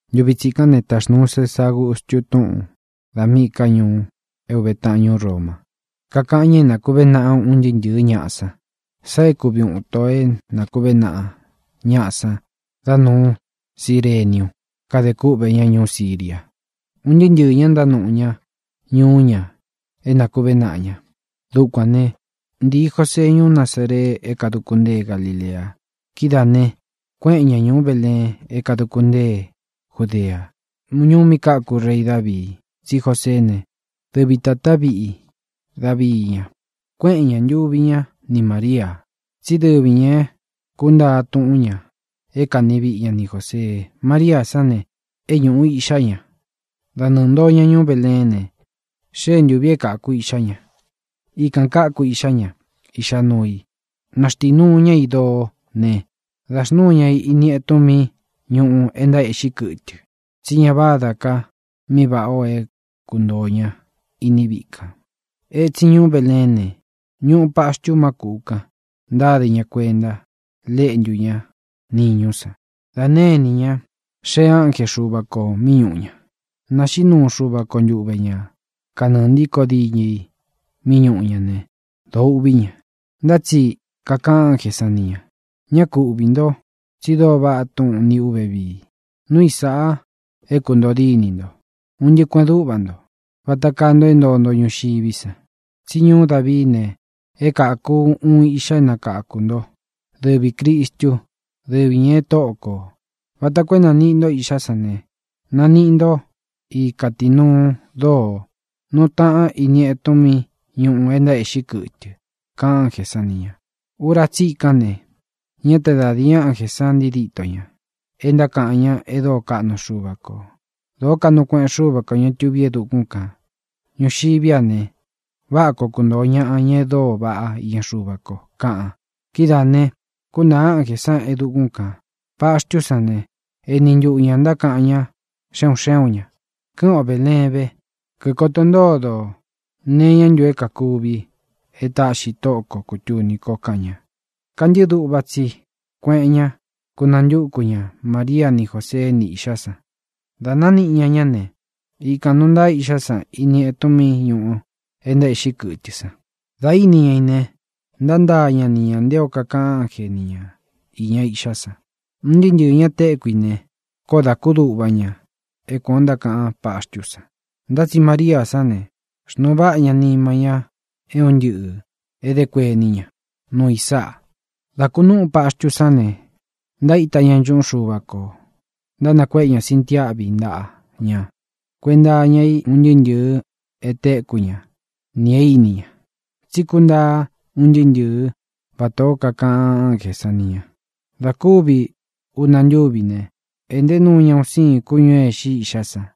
Ntuvi tsikán ne, taxnūu Césa Agustu túꞌūn da míꞌī ká ñuu é uve taꞌan ñūú Roma, kakaꞌan ña é na nākuvé naꞌa un ntɨɨ́ ntɨ̄ɨ́ ñaꞌa san. Sáꞌā e kúvi uun ito é nakuvé naꞌa ñáꞌa san dá nūu Círeniu, kade kúꞌvē ña ñuú Siria. Un ntɨɨ́ ntɨ̄ɨ́ ñaꞌa ntánuꞌu ña ñuú ña é nākuvé naꞌa ña. Dukuān né, ntīi Jósee ñuú Nazaree é kāduku ntée Galilea. Kidáā ne, kuéꞌen ña ñūú Beleen é kāduku ntée Judea, ñuú mí káku rei Davii, tsí Joseé ne, dɨvi tātá viꞌi Davii ña. Kuéꞌen ña, ntūvi ñá ni Māria, tsí dɨvi ñā é kūntaa túꞌun ñā é kani viꞌi ña ni Jōsee. Maria sán ne, é ñūꞌu iꞌxá ña. Da nɨɨ̄ ntoo ña ñuú Beleén ne, xée ntūvi é kāku iꞌxá ña. Ikān káku iꞌxá ña, iꞌxá nuu i. Náxtīnuu ñá i doo ne, dā xnúu ña i ini etun mí ñūꞌu e ntaéꞌxí kɨtɨ, tsí ña vádā ka mí vāꞌá o é kuntōo ña iní viꞌi kān. Etsin ñuú Beleén ne, ñuꞌu paxtu má kūꞌu kan, ntáde ñā kuenta léꞌntú ña niñú san. Dā née inī ña, xéē ánje Xuva kō mí ñūꞌu ña. Nāxiꞌí nuu Xuva ko ntuve ñā kanɨɨ ntíkō diñɨ i mí ñūꞌu ña ne, dōo uꞌví ña. Ntá tsi kakaꞌan ánjē san ni ña: —Ñá ku uꞌvī nto. Tsi dóo vaꞌá túꞌun nīꞌi ú ve. Núu i sāꞌa é kūntoo dínī nto, un ntɨꞌɨ kueꞌen dúꞌva nto, vata kaa nto é ntoo nto ñuxiví san. Tsí ñuu Dávií ne, é kāku uun iꞌxa é nakakū nto. Dɨvi Crīstu; dɨvi ñā é Tóꞌo kō. Vata koo é nāniꞌi nto iꞌxá san ne, naniꞌi nto i kátīnuu dóo, nuu ntaá ini etun mí ñūꞌu e ntaéꞌxí kɨtɨ —kaꞌan ánjē san ni ña. Ura tsikán ne, ñá te da dīi ánjē san ntii díto ña, e ntákaꞌan ña e dóo kaꞌnu Xuva kō: ¡Dōó kaꞌnu kueꞌen Xúva kō, ña tuví e dukún kān! ¡Ñuxiví a ne, váꞌa koo kuntōo ñaꞌa, ña e dóo vaꞌá iña Xuva ko! kaꞌan. Kidáā ne, kuntāa ánjē san e dukún kān. Paxtú san ne, eni ntuꞌu ñā ntákaꞌan ñá xe un xé un ñā: —Kɨ́ꞌɨn o Bēleén ve, kíkoto ntódo ō nee iñá ntu é kākuvi é tāꞌxi Tóꞌo ko kūtuni ko —kaꞌan ña. Kantɨ́ꞌɨ duꞌva tsi kueꞌen ña, kunantúku ña Maria ni Jósee ni iꞌxá san. Dā nániꞌi ña ñá ne, ikān nuu ntaa iꞌxá san ini etun mí ñūꞌu é ntaéꞌxí kɨtɨ san. Dā íni ña i ne, ntántaa ña nté o kakaꞌan ánje ni ñā iña iꞌxá san. Un ntɨɨ́ ntɨ̄ɨ́ ña téku i ne, koó dā kúduꞌva ña é kuān o ntákaꞌan páxtú san. Ntá tsi María sán ne, xnuu váꞌa ña nima ñá é un ntɨꞌɨ̄ é dé kuení ña nuu i sáꞌa. Dá kūnúꞌu paxtú san ne, ntaíta ña nchuꞌún Xuva kō ntánakuéꞌe ña sintiáꞌvi ntaꞌa ña kuenta iña i un ntɨɨ́ ntɨ̄ɨ é téku ña nī e íni ña, tsí kúntaa un ntɨɨ́ ntɨ̄ɨ́ vatā ó kakaꞌan ánjē san ni ña. Dā kúvi una ntúvi ne, ēꞌnté nuu ña un síin kúñū é ixi iꞌxá san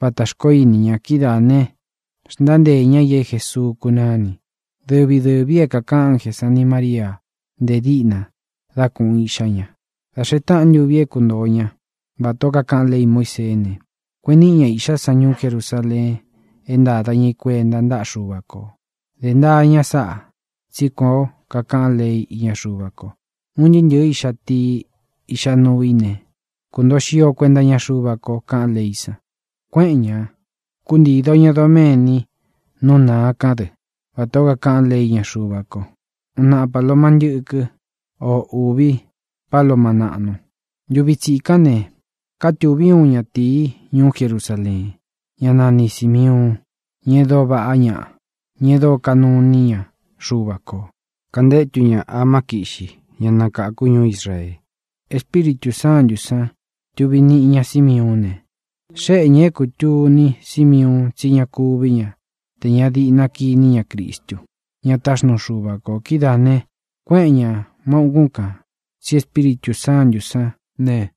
vatā xkoó ini ña. Kidáā ne, xntánteē ñá i é Jēsuu kunáni, dɨvi dɨ̄vi é kākaꞌan ánjē sán ni Māría nte díꞌna dá kūꞌun iꞌxá ña. Dā xee táꞌan ntuvi é ntuntoo ña, vatā ó kakaꞌan lei Muíseé ne, kueꞌen níꞌi ña īꞌxá san ñuú Jerusaleen é ntāda ña i kuenta ntáꞌa Xuva kō. Dé ntaa ña sáꞌā, tsí kuān ó kakaꞌan lei íña Xuva ko: “Un ntɨɨ́ ntɨ̄ɨ íꞌxa tii, iꞌxa nuu í ne, kuntoo xio kuenta iña Xuva ko”, kaꞌán leí san. Kuéꞌen ña, kūntído ña doméni nú nāa kán dɨ, vatā ó kakaꞌán lei íña Xuva ko: uun naꞌa paloma ntɨ́kɨ́n o ūvi páloma naꞌnu. Ntuvi tsikán ne, kátūví uun ñatīí ñuú Jerusaleen, ñá nani Sīmiuun ña e dóo vaꞌá ñaꞌa, e dóo kanuu iní ña Xuva kō. Kantétu ña amá kiꞌxi ña nakākú ñuú Israee. Espíritū Sántū sán tuvī niꞌi ñá Simiuún ne, xéꞌe ñā é kūtuni Símiuun tsí ña kuví ña tē ña diꞌna kiní ña Cristu, ña táxnuu Xuva kō. Kidáā ne, kuéꞌen ñā má ūkún kān, tsí Espíritū Sántū sán ne,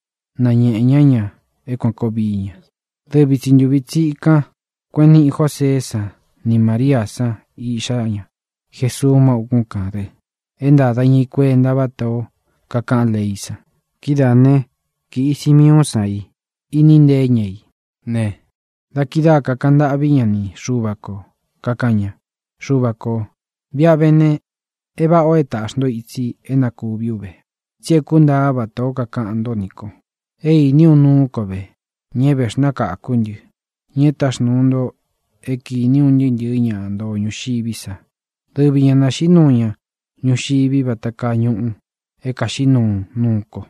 náñēꞌe ñá ña é kuān koo vií ña. Dɨvi tsi ntuvi tsīkan kuéꞌen niꞌi Jóseé san ni Māríā san iꞌxá ña Jesuu má ūkún kān dɨ é ntāda ñá i kuenta vátā ó kakaꞌan leí san. Kidáā né, kīꞌi Simiuún san i, iníꞌi nteé ña i ne, dā kidáa kākaꞌan ntâꞌví ña ni Xuva kō, kakaꞌan ña: Xuvā kó, viꞌi a vé ne, é vāꞌá o é tāꞌxi nto itsi é na kūví u ve, tsi é kuntaa vatā ó kakaꞌan ntó nī ko. É īní u nuú ko ve, ña e véxnakākú ntɨ, ña e táxnūu nto é kīni un ntɨɨ́ ntɨ̄ɨ ñá ntoo ñuxiví sa. Dɨvi ñā naxiꞌí nuu ña ñuxivi vata kaa ñuꞌu é kaxiꞌí nuu nuu ko.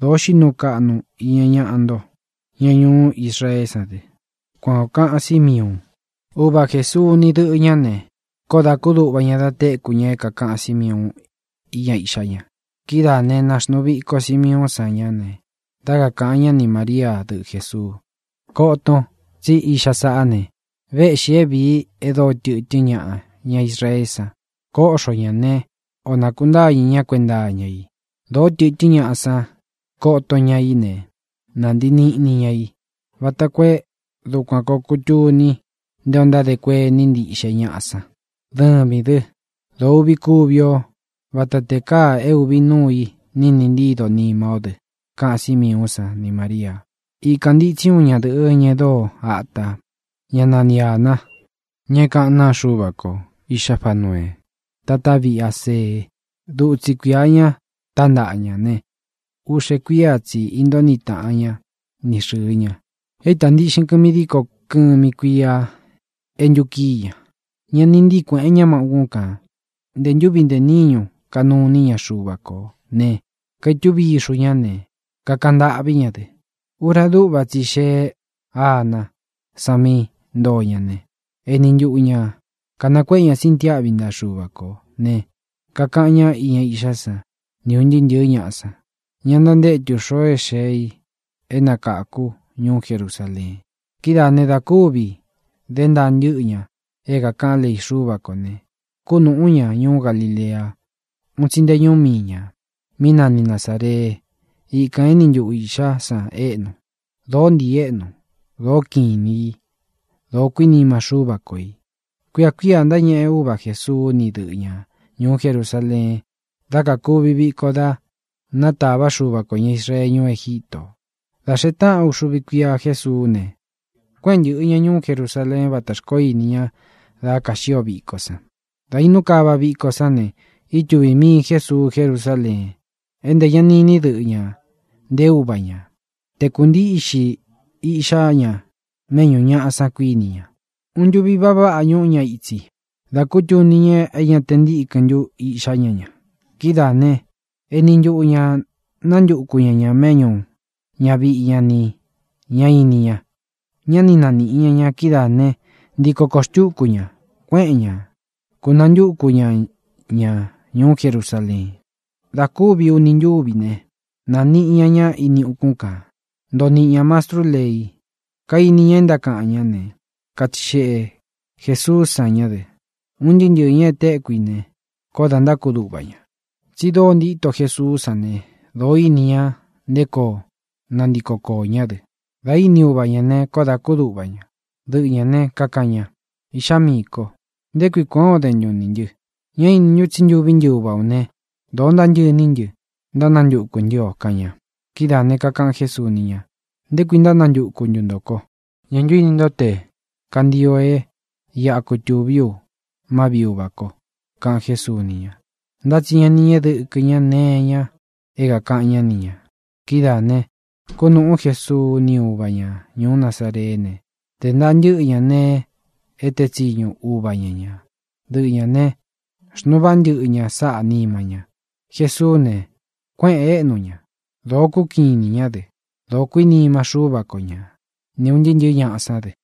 Dōo xiꞌí nuu kaꞌnu ña iña ñaꞌa nto, ña ñuú Israeé san dɨ. Kuan ō kaꞌan Símiuun. Uva Jēsuu ni dɨ́ꞌɨ ñā ne, koó dā kúduꞌva ña da téku ña é kākaꞌan Símiuun íña iꞌxá ña. Kidáā né, nāxnuu viko Simiuún san ña ne, dá kakāꞌan ñá ni Māría, dɨꞌɨ Jēsuu: —Koton tsí iꞌxa saꞌá ne, véꞌxī é vīi e dóo tɨtɨ́n ñaꞌa ña Israee sán ne, kóꞌxo ñā né, ō nakuntáñɨ̄ ñá kuenta iña i. Dōó tɨtɨ́n ñaꞌa san koto ña i ne, nantii niꞌni ña i, vata koo é dukuan koo kūtuni nté ō ntádē kuení ntiꞌxe ñaꞌa san. Dɨvīn dɨ́, dōo uꞌvi kuvi ó, vata tē káā é ūvi nuu i niꞌni ntído nima ó dɨ —kaꞌan Símiuún san ni Māríā. Íkān ntitsi úun ñadɨ̄ꞌɨ́, ña e dóo atā, ñá nanī Ana, ña é kaꞌán naa Xuva ko. Iꞌxá Fanuee, tatá viꞌi Asee. Dutsi kuia ña tántaꞌa ña ne, uꞌxe kuía tsi īntóo niꞌi taꞌan ña ni xɨ̄ɨ ña. É īta ntíꞌxin kɨmi díko kɨmi kuia é ntukíi ñā. Ñá nī ntíi kuēꞌen ña má ūkún kān. Ntē ntúvi ntē níñu kanuu iní ña Xuva kō ne, kaitúvi ixu ña ne, kakaꞌan ntâꞌví ña dɨ. Ura dúꞌva tsi i xeé Aná san mí ntōo ña ne, eni ntuꞌu ña kānakuéꞌe ña sintiáꞌvi ntaꞌa Xuva kō, ne, kakaꞌan ñá iña iꞌxá san ni ūn ntɨɨ́ ntɨ̄ɨ́ ñaꞌa san, ña ntantétu xoo é xee i é nakakū ñuú Jerusaleen. Kidáā ne, da kúvi dé ntaa ntɨ́ꞌɨ ñā é kākaꞌán lei Xúva kō ne, kúnūꞌú ña ñuú Galilea, un tsi nté ñuú mii ñā, mí nani Nazāree. Ikān éni ntuꞌu iꞌxá san éꞌnu. Dōó ntii éꞌnu. Dōó kiꞌin inī i. Dōo kuínima Xúva ko ī. Kuia kuía ntáñeꞌe uva Jēsuu ni dɨꞌɨ ñá ñuú Jerusaleen dá kakuvi viko da nátava Xuva kō ña Israee ñuú Egítō. Dā xee táꞌan uxuvi kuía Jesuú ne, kuéꞌen ntɨ̄ꞌɨ ña ñuú Jerusaleen váta xkoó ini ña da kaxío viko san. Dā inú kava viko sán ne, ítuvī mii Jésuu Jerusaleen, é ntē ña ni iní dɨꞌɨ ñā, nté uva ñā. Te kūntíꞌxi iꞌxá ña méꞌñu ñāꞌa san, kuíni ña. Uun ntuvi va váꞌa ñúꞌu ña ītsi da kútuni ña é ña te ntīkɨ́n ntu iꞌxá ña ña. Kidáā ne, eni ntuꞌu ña nántuku ña ñā méꞌñu ñāviꞌi ña ni ña ini ña. Ñá ni nāniꞌi ñá ña. Kidáā né, ntiko kōo xtúku ña, kueꞌen ñá, kūnantúku ña ña ñuú Jerusaleen. Dā kúvi uni ntúvi ne, nāniꞌi ñá ña ini ukún kān. Ntoo niꞌi ña mastrú lei, kaini ña e ntákaꞌan ñá ne, katsixeꞌe Jēsuú san ñá dɨ. Un ntɨɨ́ ntɨ̄ɨ́ ña e téku i ne, koó dā ntákuduꞌva ña, tsi dóo ntíto Jesuú san ne, dōó ini ña nté koo nantiko kōo ñá dɨ. Dā íni uva ñā ne, koó dā kúduꞌva ña. Dɨꞌɨ ñā né, kakaꞌan ña: —Iꞌxá miī ko, ¿nché kui kuān o dén ntun nī ntɨ? ¿Ñá inin ntun tsí ntuví ntɨ uva ō né, dōo ntántɨꞌɨ iní ntɨ ntánantukū ntɨ́ o? —kaꞌan ña. Kidáā ne, kakaꞌan Jésuu ni ña: —¿Nté kui ntánantuku ntu ntō ko? ¿Ñā ntu íni nto tē kantio é iꞌa kutūví u má viꞌi Uvā ko? —kaꞌan Jésuu ni ña. Ntá tsi ña ni ñéꞌe dɨkɨ ñā nee iña é kākaꞌan ñá ni ñā. Kidáā ne, kúnūꞌú Jesuu ni úva ñā ñuú Nazareé ne, dē ntaa ntɨ́ꞌɨ ña nēe e teé tsiñu uva ña ñā. Dɨꞌɨ ñā ne, xnuu váꞌa ntɨꞌɨ ña sáꞌā nima ña. Jesuú ne, kuéꞌēn éꞌnu ña. Dōo kúkiꞌin inī ñá dɨ. Dōo kuínima Xúva ko ña, ni ūn ntɨɨ́ ntɨ̄ɨ́ ñaꞌa sán dɨ.